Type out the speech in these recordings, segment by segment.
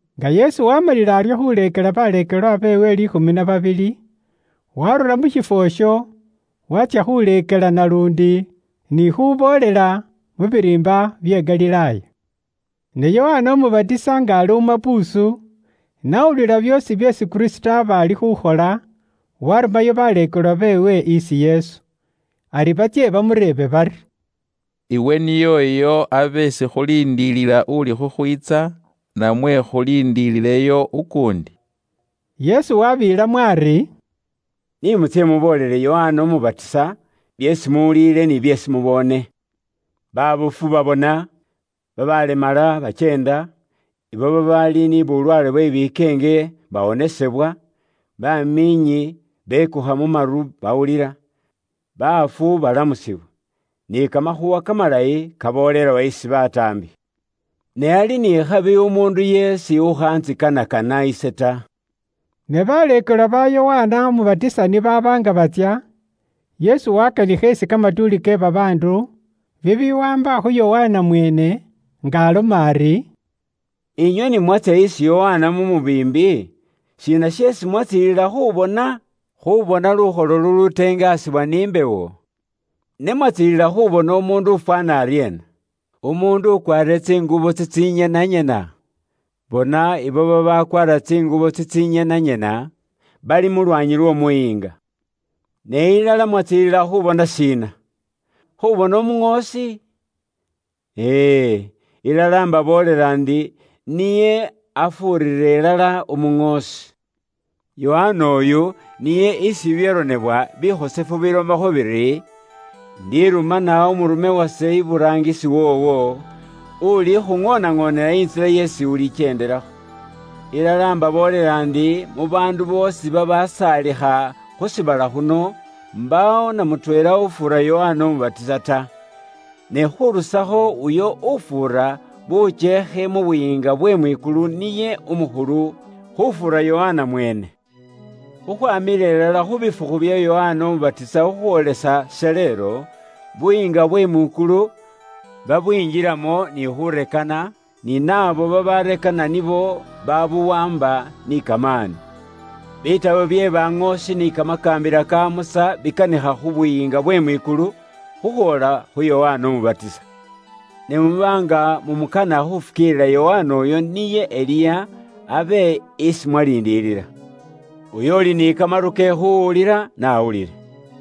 Nga Yesu waamalile aryo khuleekela baleekelwa beewe liikhumi na babili, waarura mu shiifwo isho waatsya khuleekela naluundi ni khuboolela mu biriimba bye Galilaaya. Ne Yokana Umubatisa nga ali mu mapuusu n'awulila byoosi byeesi Kristo aba ali khukhola, warumanayo baleekelwa beewe isi Yesu, ari batsye bamureebe bari, “Iwe niye uyo abe isi khuliindilila uli khukhwiitsa, namwe khuliindilileyo ukuundi?” Yesu wabeelamo ari, “Ni mutsye muboolele Yokana Umubatisa byeesi muwulile ni byeesi muboone. Baabofu babona, babaalemala bakyeenda, abo babaali ni bulwaale bwe bikeenge bawonesebwa, bamiinyi bekukha mu maru baawulila, baafu balamusibwa, ni Kamakhuuwa Kamalayi kaboolelwa isi bataambi. Ne ali ni khabi umuundu yeesi ukhantsikanakana ise ta.” Ne baleekelwa ba Yokana Umubatisa ni baaba nga batsya, Yesu wakanikha isi kamatuuli ke babaandu bibiwaamba khu Yokana mweene, nga aloma ari, “Inywe ni mwatsya isi Yokana mu mubiimbi, shiina sheesi mwatsiililila khubona? Khubona lukholo luluteengasibwa ni mbewo? Ne mwatsiililila khubona umuundu ufwaana aryeena? Umuundu ukwaarire tsingubo tsitsinyenanyena? Bona ibo babakwaara tsingubo tsitsinyenanyena bali mu lwaanyi lw'omuyiinga. Ne ilala mwatsiililila khubona shiina? Khubona umuŋoosi? E e, ilala imbaboolela ndi niye afuurira ilala umuŋoosi. Yokana oyu niye isi bibyaronebwa bikhosefu bilomakho biri, ‘Indirumana umurume wase iburaangisi woowo, ulikhuŋoonaŋoonela intsila yeesi ulikyeendelakho.’ “Ilala imbaboolela ndi, mu baandu boosi babasaalikha khu shiibala khuno, mbaawo na mutweela ufuura Yokana Umubatisa ta. Ne khurusakho uyo ufuura bukyeekhe mu Buyiinga bwe mwikulu niye umukhulu khufuura Yokana mweene. Khukhwamila ilala khu bifukhu bya Yokana Umubatisa khukhwoolesa shaleelo, Buyiinga bwe mwikulu babwinjilamo ni khurekana, ni naabo babarekana nibo babuwaamba ni kamaani. Bitabo bye baŋoosi ni kamakaambila ka Musa bikanikha khu Buyiinga bwe mwikulu khukhwoola khu Yokana Umubatisa. Ne muba nga mumukana khufukiilila, Yokana uyo niye Eliya abe isi mwaliindilila. Uyo uuli ni kamaru ke khuuwulila n'awulile.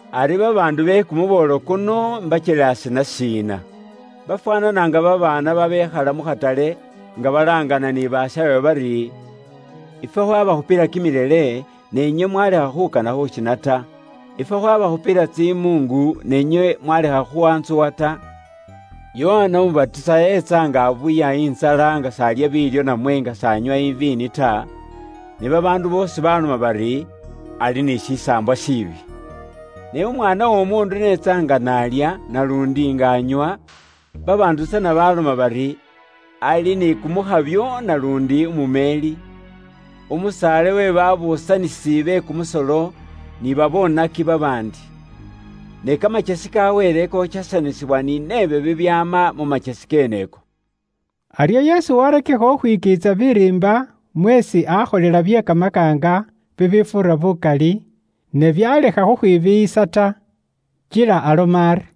“Ari babaandu be kumuboolo kuno imbakyelaase na shiina? Bafwaanana nga babaana babekhaale mu khatale, nga balaangana ni bashaawe bari, ‘Ifwe khwabakhupila kimilele ni inywe mwaalekha khukana khushiina ta, ifwe khwabakhupila tsimuungu ne inywe mwaalekha khwantsuwa ta.’ “Yokana Umubatisa eetsa nga abuya intsala nga s'alya biilyo namwe nga s'anywa iviini ta, ne babaandu boosi baloma bari, ‘Ali ni shisaambwa shiibi.’ Ne Umwaana w'Omuundu n'etsa nga naalya, naluundi nga anywa, babaandu tsana baloma bari, ‘Ali ni kumukhabyo naluundi umumeeli, umusaale we babuusanisi be kumusolo ni babonaki babaandi.’ Ne kamakyesi ka Wele kokyesanisibwa ni nebyo bibyaama mu makyesi keeneko.” Aryo Yesu waarakikha khukhwikiitsa biriimba mweesi aakholela bye kamakaanga bibifuura bukali, ne byaalekha khukhwibiiyisa ta. Kila aloma ari: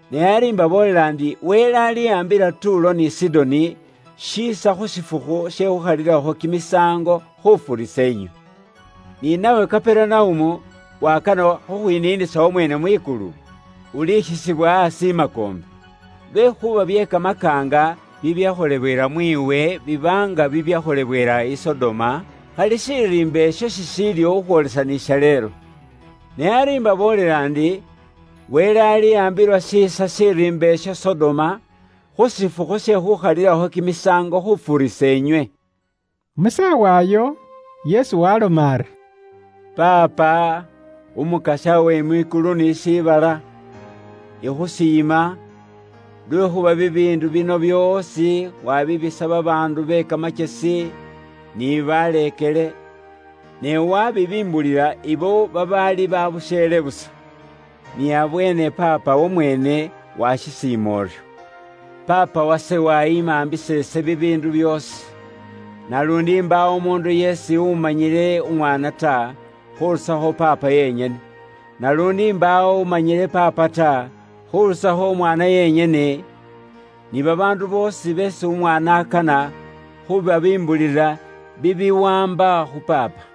Ne ari imbaboolela ndi Wele aliwaambila Tuulo ni Sidoni shiisa khu shifukhu she khuukhalilakho kimisaango khufuurisa inywe. “Ni nawe Kaperunaumu, wakana khukhwiniinisa wamweene mwikulu? Ulikhisibwa aasi i makoombe. Lwekhuuba bye kamakaanga bibyakholewela mwiiwe biba nga bibyakholewela i Sodoma, khali shiriimba isho shishiiliwo khukhwoolesa ni shaleelo. Ne ari imbaboolela ndi, Wele aliwaambila shiisa shiriimba isho Sodoma khu shifukhu she khuukhalilakho kimisaango khufuurisa inywe.” Mu saawa iyo, Yesu waaloma ari, “Paapa, Umukasya we mwikulu ni shiibala. Ikhusiima, lwekhuuba bibiindu bino byoosi wabibisa babaandu be kamakyesi ni baleekele. Ne wabibimbulila ibo babaali babusheele busa. Niabweene Paapa wamweene washisiima uryo. “Paapa wase waayimaambisa ise bibiindu byoosi. Naluundi mbaawo umuundu yeesi umanyile Umwaana ta, khurusakho Paapa yenyene. Naluundi mbaawo umanyile Paapa ta, khurusakho Umwaana yenyene, ni babaandu boosi beesi Umwaana akana khubabimbulila bibiwaamba khu Paapa.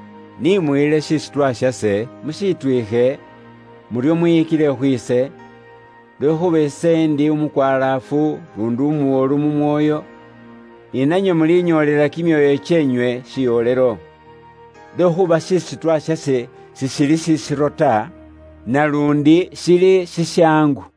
Ni muyile shisutwa shase, mushitwiikhe, muryo mwiyikile khwiise, lwekhuuba ise ndi umukwalaafu luundi umuwolu mu mwoyo, ni nanywe mulinyoolela kimyoyo kyeenywe shiwolelo. Lwekhuuba shisutwa shase sishili shisiro ta, naluundi shili shishaangu.”